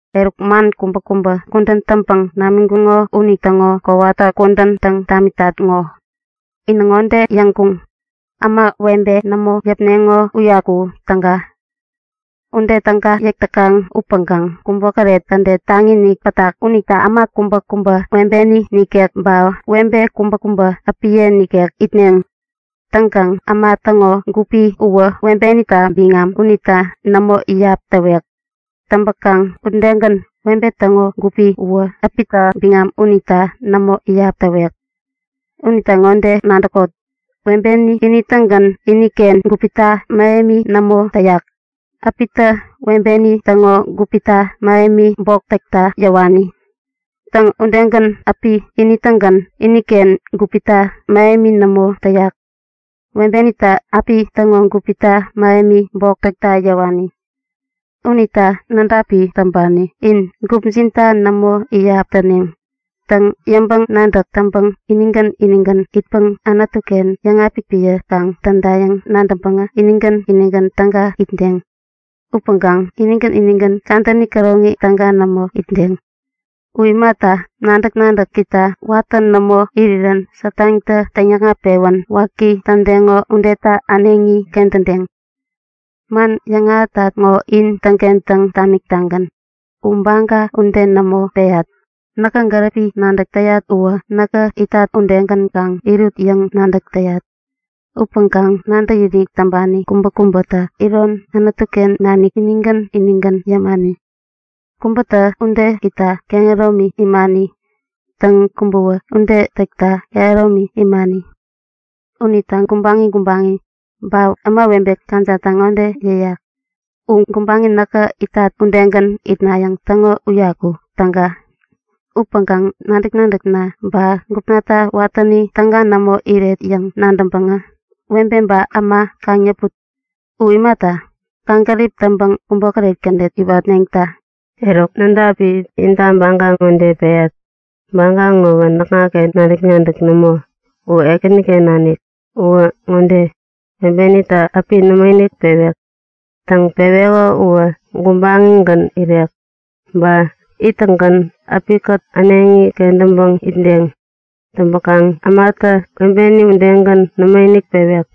Eruk, man kubäkubä kudän täŋpäŋ namiŋkuŋo unitäŋo kowata kudän täŋ tamitat ŋo. Inä ŋode yäŋkuŋ; Äma, webe nämo yäpneŋo uyaku täga. Ude täga yäk täkaŋ upäŋkaŋ kubokäret kädet taŋi-inik pätak unita äma kubäkubä webeni nikek, ba webe kubäkubä äpiye nikek itneŋ. Täŋkaŋ äma täŋo gupi uwä webenita biŋam unita nämo iyap täwek. Täŋpäkaŋ udegän, webe täŋo gupi uwä äpita biŋam unita nämo iyap täwek. Unita ŋode nadäkot; Webeni ini-tägän iniken gupita mähemi nämo täyak, äpitä webeni täŋo gupita mähemi bok täkta yäwani. Täŋ, udegän äpi ini-tägän iniken gupita mähemi nämo täyak, webenitä äpi täŋo gupita mähemi bok täkta yäwani. Unita nädapi täŋpani in, gupjinta nämo iyap täneŋ. Täŋ, yäŋpäŋ-nadäk täŋpäŋ inigän inigän itpäŋ Anutu-ken yäŋapik piä kaŋ tädayäŋ nadäŋpäŋä inigän inigän täga itdeŋ. Upäŋkaŋ inigän inigän kadäni käroŋi täga nämo itdeŋ. U imata, nadäk-nadäkita watä nämo irirän Satantä täŋyäkŋat-pewän waki tädeŋo udeta äneŋi kentädeŋ. Man yäŋahätat ŋo in täŋkentäŋ tamik-tagän. U baga ude nämo peyat. Näkä gäripi nadäk täyat uwä näkä itat udegän kaŋ irut yäŋ nadäk täyat. Upäŋkaŋ nadäkinik täŋpani kubäkubäta iron Anutu-ken nanik inigän inigän yämani. Kubätä ude itta kehäromi imani. Täŋ, kubäwä ude täkta kehäromi imani. Unita gubaŋi gubaŋi ba ämawebe kajatta ŋode yäyat; U gubaŋi näkä itat udegän itnayäŋ täŋo uyaku täga. Upäŋkaŋ nadäk-nadäkna ba gupnata watäni täga nämo iret yäŋ nadäŋpäŋä webe ba äma kaŋ yäput. U imata, kaŋgärip täŋpäŋ kubokäret kädet iwatneŋta. Eruk, nädapi inta baga ŋode peyat. Baga ŋowä näkŋaken nadäk-nadäk nämo, u Ekäniken nanik. Uwä ŋode; Webenitä äpi nämoinik pewek. Täŋ, peweko uwä gubaŋigän irek, ba ittäŋgän äpikät äneŋi kentäŋpäŋ itdeŋ. Täŋpäkaŋ ämatä webeni udegän, nämoinik pewek.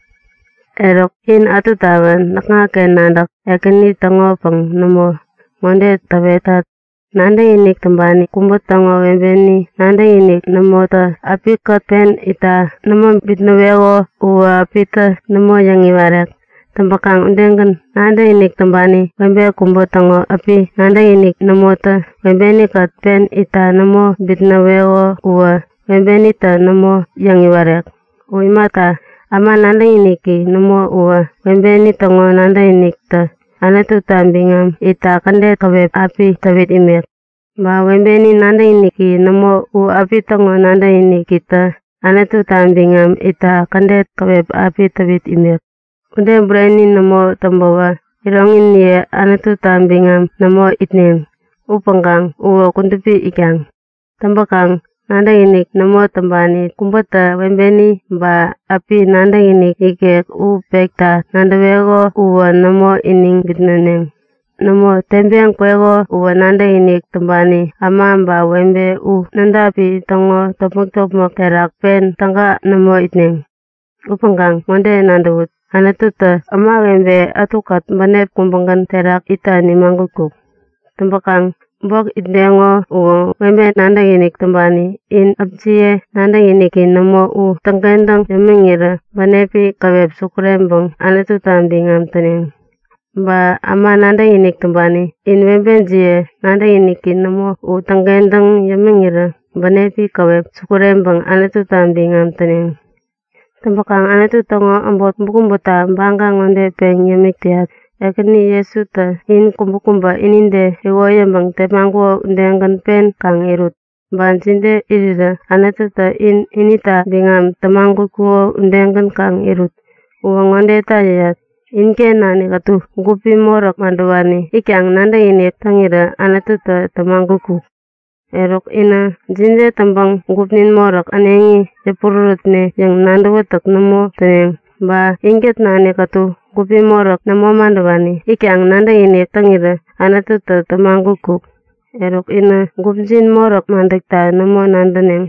Eruk, in ätutawä näkŋaken nadäk, Ekäni täŋopäŋ nämo, ŋode täwetat; Nadäkinik täŋpani kubä täŋo webeni nadäkiniki nämotä äpikät pen itta nämo bitnäweko uwä äpitä nämo yäŋ-iwarek. Täŋpäkaŋ udegän, nadäkinik täŋpani webe kubä täŋo äpi nadäkiniki nämotä webeni-kät pen itta nämo bitnäweko uwä webenitä nämo yäŋ-iwarek. U imata, äma nadäkiniki nämo uwä webeni täŋo nadäkinikitä Anututa biŋam itta kädet käwep api täwit imek. Ba webeni nadäkiniki nämo u äpi täŋo nadäkinikitä Anututa biŋam itta kädet käwep api täwit imek. Ude bureni nämo täŋpäwä iroŋiniye Anututa biŋam nämo itneŋ. Upäŋkaŋ uwä kudupi itkaŋ. Täŋpäkaŋ nadäkinik nämo täŋpani kubätä webeni ba äpi nadäkinik ikek u pekta nadäweko uwä nämo iniŋ bitnäneŋ. Nämo, teŋpeŋ kweko uwä nadäkinik täŋpani äma ba webe u nädapi täŋo topmäk-topmäk terak pen täga nämo itneŋ. Upäŋkaŋ ŋode nadäwut; Anututä ämawebe ätukät bänep kubägän terak itta nimagutkuk. Täŋpäkaŋ bok itdeŋo uwä webe nadäkinik täŋpani in äpjiye nadäkiniki nämo u täŋkentäŋ yämiŋirä bänepi käwep sukureŋpäŋ Anututa biŋam täneŋ. Ba äma nadäkinik täŋpani in webejiye nadäkiniki nämo u täŋkentäŋ yämiŋirä bänepi käwep sukureŋpäŋ Anututa biŋam täneŋ. Täŋpäkaŋ Anutu täŋo äbot kubäkubäta baga ŋode peŋ yämik täyat; Ekäni Jesutä in kubäkubä inide iwoyäŋpäŋ tepmaŋkuko udegän pen kaŋ irut. Ba jide irirä Anututä in inita biŋam tämagutkuko udegän kaŋ irut. Uwä ŋodeta yäyat; Inken nanik ätu gupi moräk madäwani itkaŋ nadäkinik täŋirä Anututä tämagutkuk. Eruk, inä jide täŋpäŋ gupnin moräk äneŋi yäpurärätne yäŋ nadäwätäk nämo täneŋ. Ba inkät nanik ätu gupi moräk nämo madäwani itkaŋ nadäkinik täŋirä Anututä tämagutkuk. Eruk, inä gupjin moräk madäkta nämo nadäneŋ.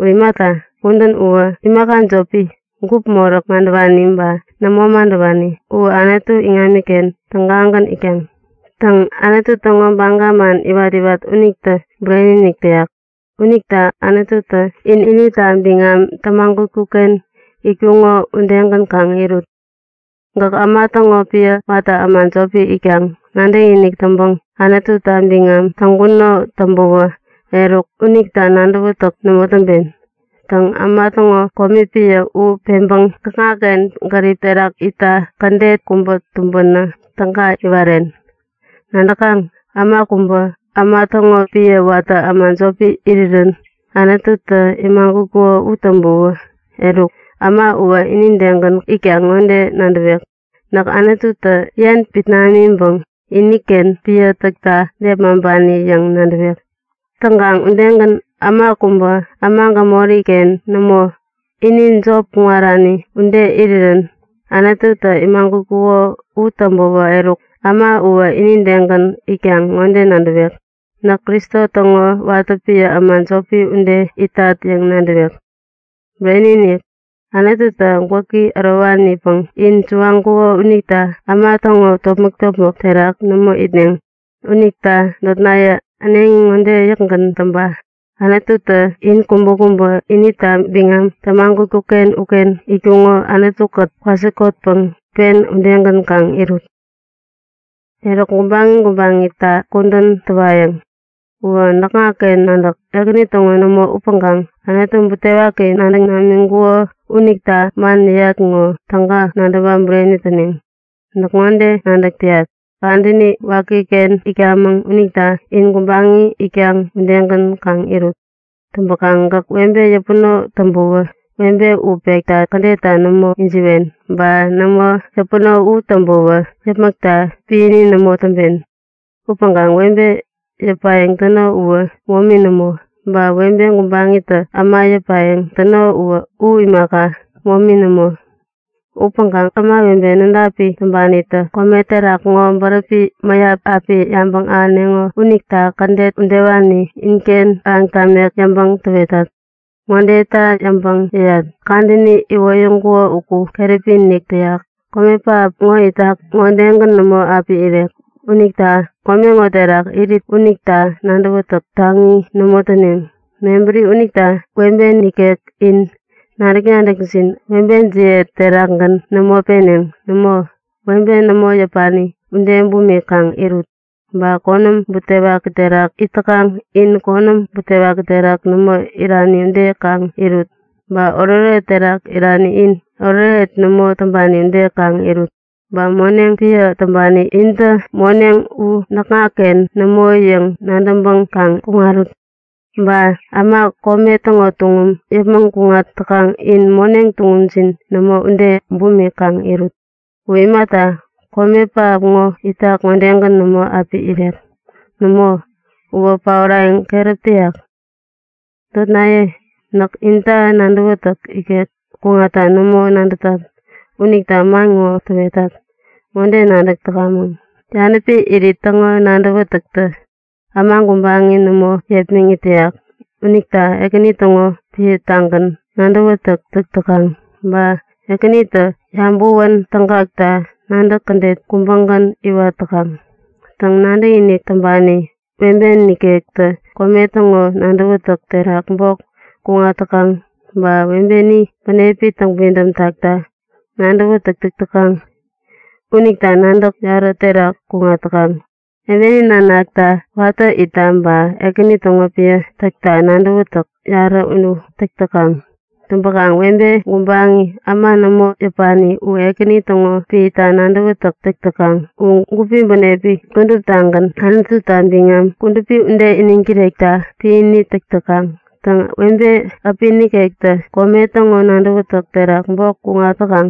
U imata, kudän uwä imaka jopi. Gup moräk madäwani ba nämo madäwani u Anutu iŋamiken tägagän itkaŋ. Täŋ, Anutu täŋo baga man iwat-iwat unitä bureni-inik täyak. Unita Anututä in inita biŋam tämagutkuk-ken itkuŋo udegän kaŋ irut. Gäk äma täŋo piä watä äma jopi itkaŋ nadäkinik täŋpäŋ Anututa biŋam täŋkuno täŋpäwä eruk, unita nadäwätäk nämo täŋpen. Täŋ, äma täŋo komi piä u peŋpäŋ gäkŋaken gärip terak itta kädet kubä tumbänä täga iwaren. Nadäkaŋ? Äma kubä äma täŋo piä watä äma jopi irirän Anututä imagutkuko u täŋpäwä eruk, äma uwä inidegän itkaŋ ŋode nadäwek; Näk Anututä yen pit namiŋpäŋ iniken piä täkta nepmaŋpani yäŋ nadäwek. Täŋkaŋ udegän äma kubä äma gämori-ken nämo, ini jop kuŋarani ude irirän Anututä imagutkuko u täŋpäwä eruk äma uwä inidegän itkaŋ ŋode nadäwek; Näk Kristo täŋo watä piä äma jopi ude itat yäŋ nadäwek. Bureni-inik, Anututä gwäki ärowani-inikpäŋ in suwaŋkuko unita äma täŋo topmäk-topmäk terak nämo itneŋ. Unita notnaye äneŋi ŋode yäkgän täŋpa; Anututä in kubäkubä inita biŋam tämagutkuk-ken uken itkuŋo Anutu-kät kwasikotpäŋ pen udegän kaŋ irut. Eruk, gubaŋi gubaŋita kudän täwayäŋ. Uwä näkŋaken nadäk, Ekäni täŋo nämo upäŋkaŋ Anutu butewaki nadäŋ namiŋkuko unita man yäyat ŋo täga nadäwä bureni täneŋ. Näk ŋode nadäk täyat; Kadäni wakiken itkamäŋ unita in gubaŋi itkaŋ udegän kaŋ irut. Täŋkaŋ gäk webe yäpuno u täŋpäwä webe u pekta kädetta nämo wäyäkŋewen. Ba nämo yäpuno u täŋpäwä yäpmäkta piäni nämo täŋpen. Upäŋkaŋ webe yäpayäŋ täno uwä momi nämo. Ba webe gubaŋitä äma yäpayäŋ täko u imaka, momi nämo. Upäŋkaŋ ämawebe nädapi täŋpanitä kome terak ŋo bäräpi mäyap api yabäŋ ahäneŋo unita kädet udewani inken ahäŋ tamek yäŋpäŋ täwetat. Ŋodeta yäŋpäŋ yäyat; Kadäni iwoyäŋkuko uku keräpi-inik täyak, kome pähap ŋo itak ŋodegän nämo api irek. Unita kome ŋo terak irit unita nadäwätäk taŋi nämo täneŋ. Mebäri unita webe nikek in nadäk-nadäkjin webejiye terakgän nämo peneŋ. Nämo, webe nämo yäpani ude bumik kaŋ irut. Ba konäm butewaki terak it täkaŋ in konäm butewaki terak nämo irani ude kaŋ irut. Ba oretoret terak irani in oretoret nämo täŋpani ude kaŋ irut. Ba moneŋ piä täŋpani intä moneŋ u näkŋaken nämo yäŋ nadäŋpäŋ kaŋ kuŋarut. Ba äma kome täŋo tuŋum yäpmäŋ kuŋat täkaŋ in moneŋ tuŋumjin nämo ude bumik kaŋ kuŋarut. U imata, kome pähap ŋo itak ŋodegän nämo api irek. Nämo, uwä paorayäŋ keräp täyak. Notnaye, näk intä nadäwätäk ikek kuŋatta nämo nadätat unita man ŋo täwetat. Ŋode nadäk täkamäŋ; Yanäpi irit täŋo nadäwätäktä äma gubaŋi nämo yepmäŋit täyak unita Ekäni täŋo piätagän nadäwätäk täk täkaŋ, ba Ekänitä yabäwän tägakta nadäk kädet kubägän iwat täkaŋ. Täŋ, nadäkinik täŋpani webe nikektä kome täŋo nadäwätäk terak bok kuŋat täkaŋ. Ba webeni bänepi täŋpidäm takta nadäwätäk täk täkaŋ. Unita nadäk yarä terak kuŋat täkaŋ, webeni nanakta watä itta ba Ekäni täŋo piä täkta nadäwätäk yarä u täk täkaŋ. Täŋpäkaŋ webe gubaŋi, äma nämo yäpani u Ekäni täŋo piäta nadäwätäk täk täkaŋ. U gupi bänepi kuduptagän Anututa biŋam kudupi ude iniŋ kirekta piäni täk täkaŋ. Täŋ, webe äpi nikektä kome täŋo nadäwätäk terak bok kuŋat täkaŋ.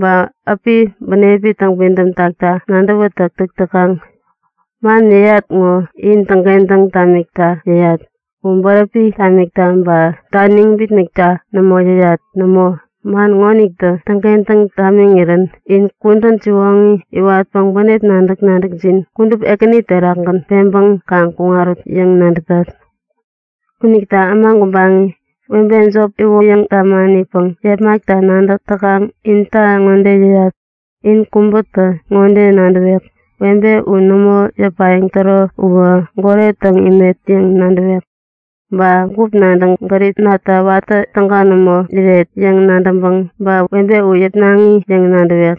Ba äpi bänepi täŋpidäm takta nadäwätäk täk täkaŋ. Man yäyat ŋo in täŋkentäŋ tamikta yäyat. U bäräpi tamikta ba taniŋ bitnäkta nämo yäyat. Nämo, man ŋonitä täŋkentäŋ tamiŋirän in kudän siwoŋi iwatpäŋ bänep nadäk-nadäkjin kudup Ekäni terakgän peŋpäŋ kaŋ kuŋarut yäŋ nadätat. Unita äma gubaŋi, webe jop iwoyäŋ tamanipäŋ yepmakta nadäk täkaŋ inta ŋode yäyat; In kubätä ŋode nadäwek; Webe u nämo yäpayäŋ täro uwä goret täŋ imet yäŋ nadäwek. Ba gup nadäŋ gäripnata watä täga nämo iret yäŋ nadäŋpäŋ, ba webe u yäpnaŋi yäŋ nadäwek.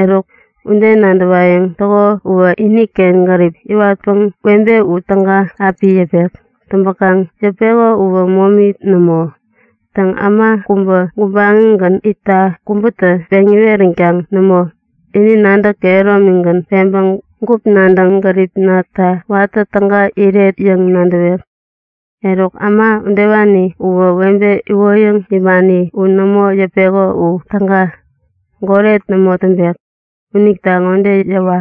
Eruk ude nadäwayäŋ täko uwä iniken gärip iwatpäŋ webe u täga api yäpek. Täŋpäkaŋ yäpeko uwä momi nämo. Täŋ, äma kubä gubaŋigän itta kubätä peŋ iweränkaŋ nämo, ini nadäk kehäromigän peŋpäŋ gup nadäŋ gäripnata watä täga iret yäŋ nadäwek. Eruk, äma udewani uwä webe iwoyäŋ imani u nämo yäpeko u täga. Goret nämo täŋpek. Unita ŋode yäwa;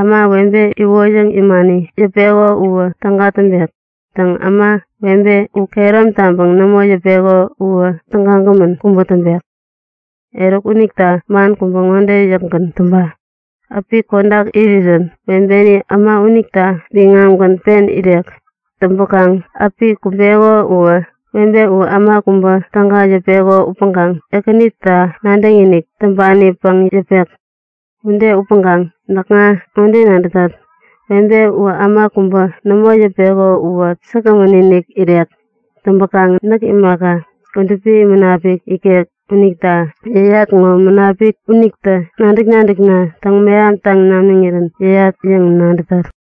Äma, webe iwoyäŋ imani yäpeko uwä täga täŋpek. Täŋ äma, webe u kehärom taŋpäŋ nämo yäpeko uwä tägagämän kubä täŋpek. Eruk unita man kubä ŋode yäkgän täŋpa; Äpi kodak irirän webeni äma unita biŋamgän pen irek. Täŋpäkaŋ äpi kumbeko uwä webe u äma kubä täga yäpeko upäŋkaŋ Ekänita nadäkinik täŋpanipäŋ yäpek. Ude upäŋkaŋ näkŋa ŋode nadätat; Webe u äma kubä nämo yäpeko uwä säkgämän-inik irek. Täŋpäkaŋ näk imaka, Kudupi Munapik ikek unita yäyat ŋo Munapik unitä nadäk-nadäkna täŋmeham taŋ namiŋirän yäyat yäŋ nadätat.